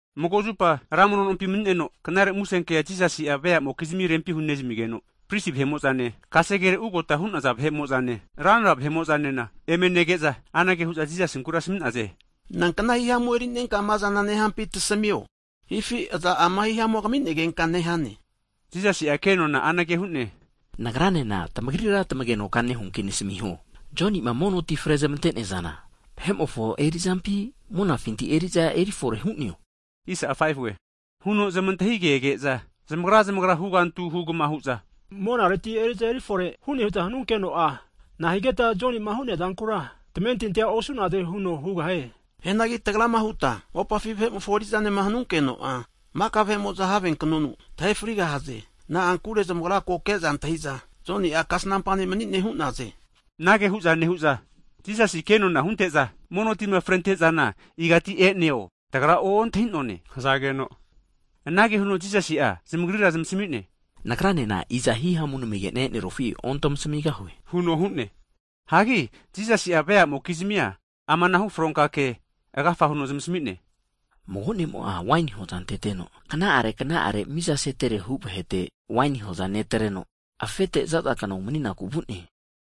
Mago zupa ra mono nompi mani'neno, knare musenkea Jisasi'a vea'mokizmi rempi hunezmigeno, prisi vahe'mo'zane, kasegere ugota hu'naza vahe'mo'zane, ranra vahe'mo'zanena eme nege'za, anage hu'za Jisasinkura asmi'naze, nankna himamu eri'nenka amazana nehampi tasamio, hifi i'za ama hihamua kaminegenka nehane? Jisasi'a kenona anage hu'ne, Nagranena tamagrira tamagenoka hugahuanki nasmiho. Joni'ma mono ti frezmante'neazana, vahe'mofo eri'zampi, monafinti eri'za eri fore hu'neo? Huno zamantahigege'za, zamagra zamagra hugantu hugama hu'za, Monareti eriza erifore hu'ne huta hanunkeno'a, nahigeta Jonima hu'neazankura tamentinti osu'naze? Huno hugahie. Hianagi tagrama huta mopafi vahe'mofo eri'zanema hanunkeno'a, maka vahe'mo'za have knonu tahefrigahaze. Na'ankure zamagra ko keza antahiza Joni'a kasnampa ne' mni'ne hu'naze. Anage hu'za nehu'za, Jisasi kenona hunte'za, mono tima frentezana igati e'neo tagra ontahi'none hazageno, anage huno Jisasi'a zamagrira zmasami'ne, nagranena i'za hihamu namigena e'nerufi ontamasmigahue huno hu'ne. Hagi Jisasi'a veamokizmia amanahu fronka kea agafa huno zamasmine. Mago ne'mo'a waini hoza anteteno, kna'are kna'are mizaseterehu (rent) vahete waini hoza'a netreno, afete zazakna umaninaku vu'ne.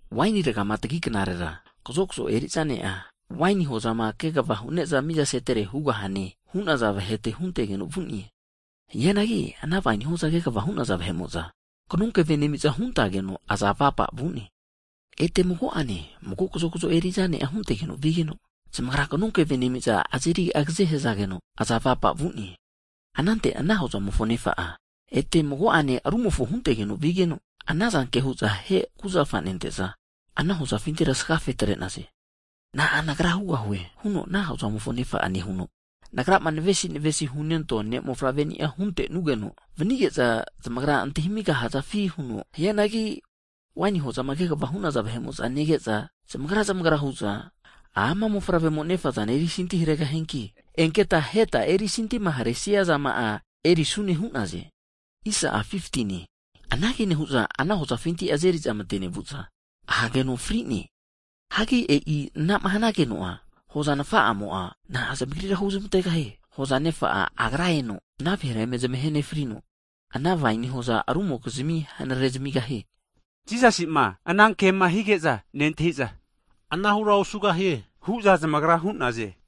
Waini ragama tagi knarera kazokzo eri'za ne'a, waini hozama kegva hu'ne'za mizasetere hugahune hu'naza vahete huntegeno vu'ne. Hianagi ana waini hoza kegva hu'naza vahe'mo'za kanonkeve nemiza, huntageno aza avapa vu'ne. Ete mago'ane, mago kazokzo eri'za ne'a huntegeno vigeno, zamagra knokeve nemiza azeri agaze hazageno, aza avapa vu'ne. Anante ana hozamofo nefa'a, ete mago'ane rumofo huntegeno vigeno, anazanke hu'za ahe kuzafa nente'za, ana hozafintira asagfe atre'naze. Na'a nagra hugahue? huno ana hozamofo nefa'a nehuno, nagrama navesi navesima hunentoa ne' mofavreni'a huntenugeno vanige'za, zamagra antahimigahazafi huno hu'ne. Hianagi waini hozama kegva hu'naza vahe'mo'za nege'za, zamagra zamagra hu'za, amana mofavre'mo nefazana erisanti haregahianki, enketa aheta erisantima haresiazama'a erisune hu'naze. Anage nehu'za azeri'za ana hozafinti mate nevu'za ahageno fri'ne. Hanki e'i anama hanageno'a hoza nfa'amo'a, na'a zamagrira huzmantegahie? Hoza nefa'a Agra eno ana vahera eme zmahe nefrino, ana waini hoza rumokizmi hanare zamigahie. Jisasima ana kema hige'za nentahiza, anahura osugahie hu'za zamagra hu'naze!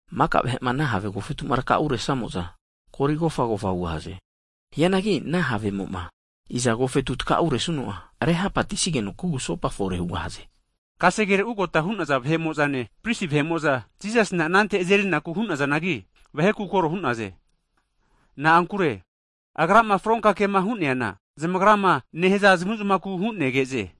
Maka vahe'ma ana have agofetuma takauresamo'za, kori kofagofa hugahaze. Hianagi ana havemoma iza agofetu takauresuno'a, rehapatisigeno kugusopa fore hugahaze. Kasegere ugota hu'naza vahe'mozane, prisi vahe'mo'za Jisasina anante azerinaku hunazanagi, vaheku kore hu'naze. Na'ankure Agrama fronka kema hu'neana zamagrama nehaza zamuzmaku hu'negeze.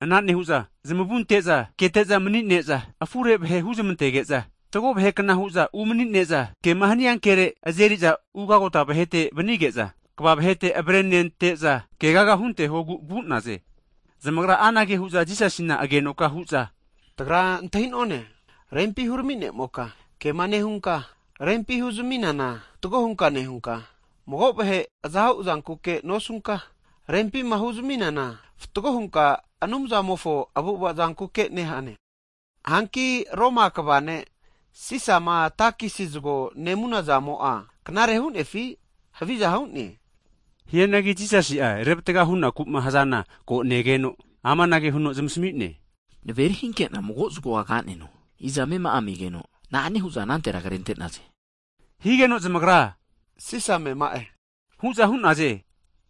Ana nehu'za zmavu anteza keteza manine'za, afure vahe huzmantege'za, fatgo vahekna huza umnine'za kema hania kere azeriza ugagota vahete (gavana) vnige'za, kva vahete avrenente'za kegaga huntehogu vu'naze. Zamagra anage hu'za Jisasina agenoka hu'za, tagra antahinone, Rempi hurami nemoka, kema nehunka rempi huzaminana fatgo hunka nehunka, mago vahe aza huzankuke nosunka, rempima huzaminana fatgo hunka Anumzamofo avu'avazankuke nehane. Hanki Roma kva ne' Sisama takisi zgo nemunazamo'a knare hunefi, haviza hu'ne? Hianagi Jisasi'a revatga hunaku'ma hazana ko negeno, amanage huno zamasmi'ne, Naveri hinkena mago zgoa kaneno, iza amema'a megeno, na'ane hu'za anantera krente'naze? Higeno, zamagra Sisa amema'e hu'za hu'naze.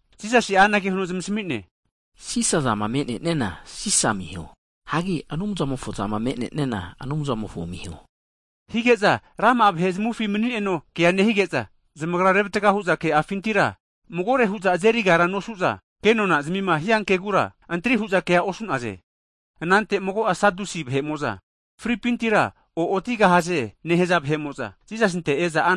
Jisasi'a anage huno zmasamine, Sisa zama me'neniana Sisa amiho. Hagi Anumzamofo zama me'neniana Anumzamofo amiho. Hige'za rama'a vahe zamavufi manineno kea nehige'za, zamagra revatga hu'za ke'afintira magore hu'za azerigara nosu'za, kenona zmima hiankegura antri hu'za kea osu'naze. Anante mago'a Sadusi vahe'mo'za, fripintira o'otigahaze nehaza vahe'mo'za, Jisasinte e'za,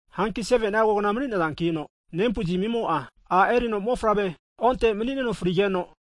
Hanki 7ni'a kogna mani'nazankino nempuzmimo ara erino mofavre onte manineno frigeno,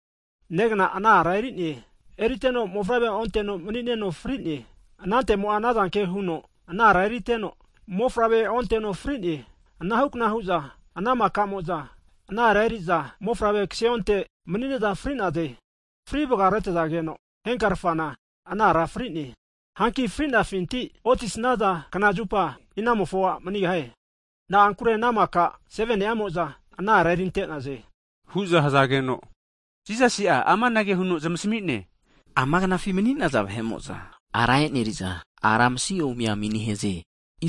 negna ana ara eri'ne. Eriteno mofavre onte manineno fri'ne. Anantemo'a anazanke huno ana ara erinteno, mofavre onteno frine. Anahukna hu'za ana maka'mo'za ana ara eri'za mofavre kaseonte manine'za fri'naze. Fri vgaretazageno henkarfana ana ara fri'ne. Hanki fri'nafinti oti snaza knazupa, inamofo a' manigahie? Na'ankure ana maka 7ni'amo'za ana ara erintenaze, hu'za hzageno, Jisasi amanage huno zamasmi'ne, ama knafi mani'naza vahe'mo'za ara e'neriza, ara masi ome ami nehaze.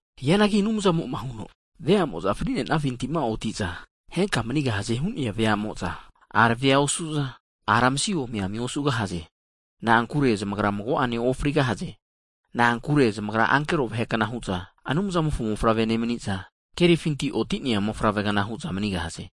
Hianagi Anumzamo'ma huno, veamo'za fri'nenafintima oti'za henka manigahaze hu'nea veamo'za, arave osu'za, ara masi omi ami osugahaze. Na'ankure zamagra mago'ane ofrigahaze. Na'ankure zamagra ankero vahekna hu'za, Anumzamofo Mofavre nemniza, kerifinti oti'nea mofavregna hu'za manigahaze.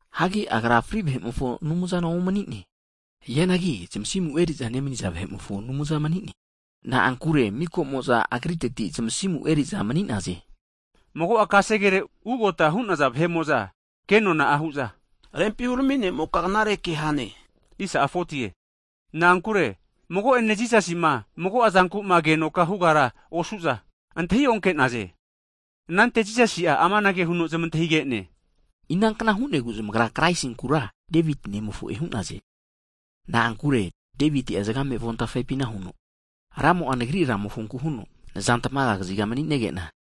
Hagi Agra fri vahe'mofo Aumzana omnine. Hianagi zmasimu eri'za nemniza vahe'mofo Anumza mni'ne. Na'ankure mikamo'za agriteti zmasimu eriza mni'naze. Mago'a kasegere ugota hu'naza vahe'mo'za kenona'a hu'za, Rempi Hurami Ne'moka knare ke hane hu'za hu'naze. Na'ankure mago'ene Jisasi'ma mago'azankuma agenoka hugara osu'za, antahionke'naze. Anante Jisasi'a amanage huno zamantahige'ne, inankna hu'negu zamagra Kraisinkura Deviti nemofo'e hu'naze? Na'ankure Deviti'a zgame avontafepina huno, Ramo'a nagri Ramofonku huno, nazantmaga kaziga mani'negena,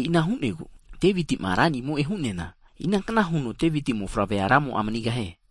E'ina hu'negu Deviti'ma Ranimo'e hu'neana, inankna huno Deviti mofavrea Ramo'a manigahie?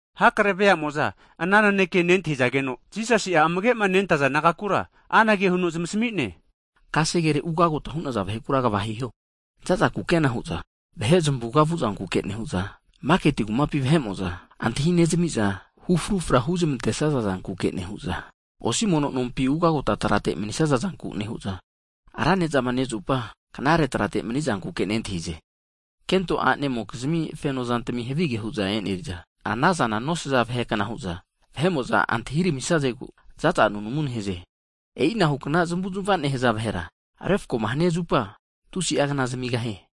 Hakare veamo'za ana naneke nentahizageno, Jisasi'a amage'ma nentaza disaipol nagakura anage huno zmasami'ne, kasegere ugota hu'naza vahekura kva hiho. Zaza kukena hu'za vahe zmavuga vu'zankuke nehu'za, maketi kumapi vahe'mo'za antahinezmiza hu frufra huzmantesaza zanku nehu'za, osi mono nompi ugota trate manisaza zanku nehu'za, ra nezama nezupa, knare trate mni'zankuke nentahize. Kento a'nemokizmi fenozantami havige hu'za eneriza, anaza nosaza vahekna hu'za, vahe'mo'za antahiramisazegu zaza nunamu nehaze. E'inahukna zmavuzmava nehaza vahera, refkoma hania zupa tusi'a knaza zamigahie.